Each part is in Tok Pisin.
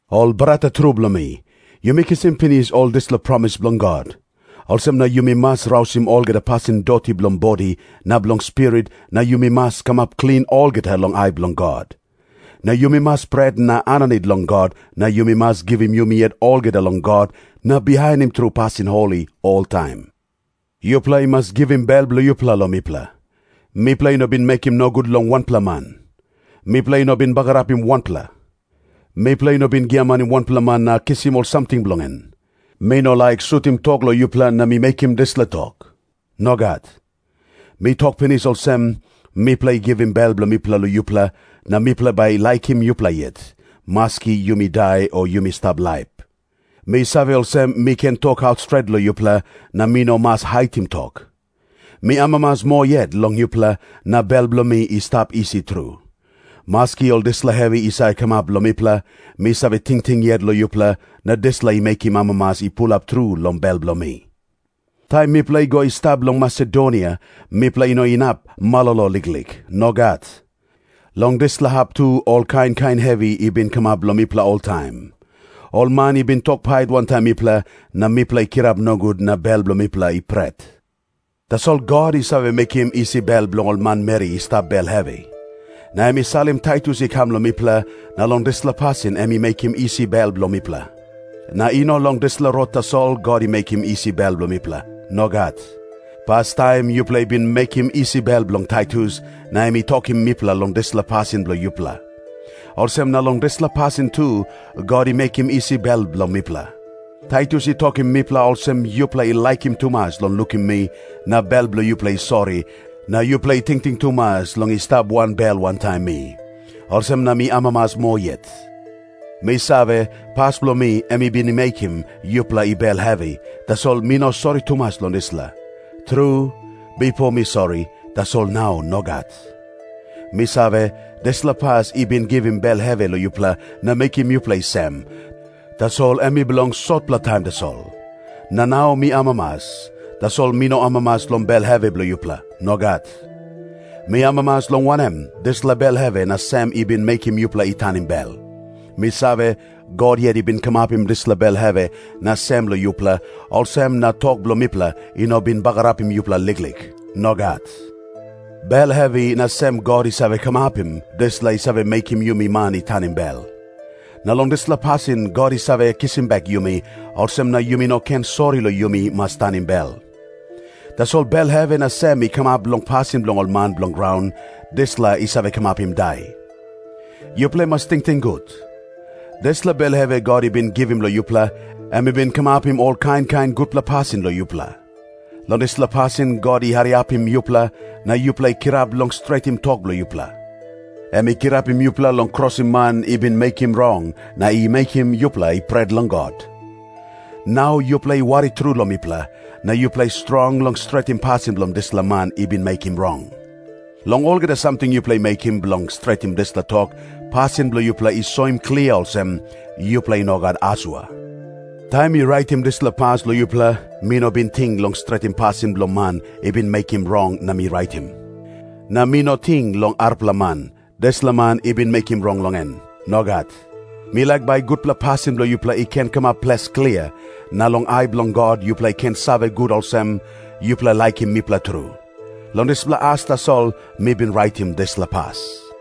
Ol brata tru bilong mi, yumi kisim pinis ol dispela promis bilong God. Olsem na yumi mas rausim olgeta pasin doti bilong bodi na bilong spirit, na yumi mas kamap klin olgeta long ai bilong God. Na yumi mas pret na aninit long God na yumi mas givim yumi yet olgeta long God na bihainim tru pasin holi oltaim. Yupela i mas givim bel bilong yupela long mipela. Mipela i no bin mekim nogut long wanpela man. Mipela i no bin bagarapim wanpela. Mipela i no bin giamanim wanpela man na kisim ol samting bilong en. Mi no laik sutim tok long yupela na mi mekim dispela tok. Nogat. Mi tok pinis olsem, mipela i givim bel bilong mipela long yupela, na mipela bai i laikim yupela yet, maski yumi dai o yumi stap laip. Mi save olsem, mi ken tokaut stret long yupela, na mi no mas haitim tok. Mi amamas moa yet long yupela, na bel bilong mi i stap isi tru. Maski ol dispela hevi i save kamap long mipela, mi save tingting yet long yupela, na dispela i mekim amamas i pulap tru long bel bilong mi. Taim mipela i go i stap long Masedonia, mipela i no inap malolo liklik. Nogat. Long dispela hap tu ol kain kain hevi i bin kamap long mipela oltaim. Ol man i bin tok pait wantaim mipela, na mipela i kirap nogut na bel bilong mipela i pret. Tasol God i save mekim isi bel bilong ol manmeri i stap bel hevi. Na em i salim Taitus i kam long mipela, na long dispela pasin em i mekim isi bel bilong mipela. Na i no long dispela rot tasol God i mekim isi bel bilong mipela. Nogat. Pastaim yupela i bin mekim isi bel bilong Taitus, na em i tokim mipela long dispela pasin bilong yupela. Olsem na long dispela pasin tu God i mekim isi bel bilong mipela. Taitus i tokim mipela olsem yupela i laikim tumas long lukim mi, na bel bilong yupela i sori, na yupela i tingting tumas long i stap wanbel wantaim mi. Olsem na mi amamas moa yet. Mi save, pas bilong mi em i bin mekim yupela i bel hevi, tasol mi no sori tumas long dispela. Tru, bipo mi sori, tasol nau nogat. Mi save, dispela pas i bin givim bel hevi long yupela na mekim yupela i sem, tasol em i bilong sotpela taim tasol. Na nau mi amamas, tasol mi no amamas long bel hevi bilong yupela. Nogat. Mi amamas, long wanem, dispela bel hevi na sem i bin mekim yupela i tanim bel. Mi save, God yet i bin kamapim dispela bel hevi na sem long yupela, olsem na tok bilong mipela i no bin bagarapim yupela liklik. Nogat. Bel hevi na sem God i save kamapim, dispela i save mekim yumi man i tanim bel. Na long dispela pasin God i save kisim bek yumi, olsem na yumi no ken sori long yumi mas tanim bel. Tasol bel hevi na sem i kamap long pasin bilong ol man bilong graun, dispela i save kamapim dai. Yupela i mas tingting gut. Dispela bel hevi God i bin givim long yupela, em i bin kamapim ol kain kain gutpela pasin long yupela. Long dispela pasin God i hariapim yupela, na yupela i kirap long stretim tok bilong yupela. Em i kirapim yupela long krosim man i bin mekim rong, na i mekim yupela i pret long God. Nau yupela i wari tru long mipela, na yupela i strong long stretim pasin bilong dispela man i bin mekim rong. Long olgeta samting yupela i mekim bilong stretim dispela tok, pasin bilong yupela i soim klia olsem, yupela i no gat asua. Taim mi raitim dispela pas long yupela, mi no bin ting long stretim pasin bilong man i bin mekim rong na mi raitim. Na mi no ting long arapela man, dispela man i bin mekim rong long en. Nogat. Mi laik bai gutpela pasin bilong yupela i ken kamap ples klia, na long ai bilong God yupela i ken save gut olsem, yupela i laikim mipela tru. Long dispela as tasol mi bin raitim dispela pas.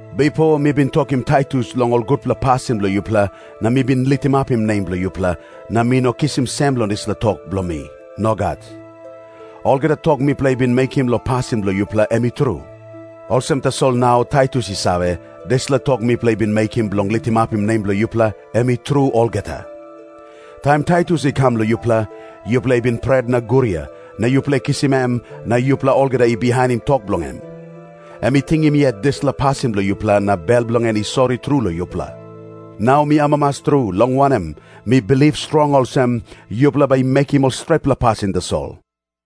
Bipo mi bin tokim Taitus long ol gutpela pasin bilong yupela na mi bin litimapim nem bilong yupela, na mi no kisim sem long dispela tok bilong mi. Nogat. Olgeta tok mipela i bin mekim long pasin bilong yupela, em i tru. Olsem tasol nau Taitus i save, dispela tok mipela i bin mekim bilong litimapim nem bilong yupela, em i tru olgeta. Taim Taitus i kam long yupela, yupela i bin pret na guria, na yupela i kisim em na yupela olgeta i bihainim tok bilong em. Em i tingim yet dispela pasin bilong yupela na bel bilong en i sori tru long yupela. Nau mi amamas tru, long wanem, mi bilip strong olsem, yupela bai i mekim ol stretpela pasin tasol.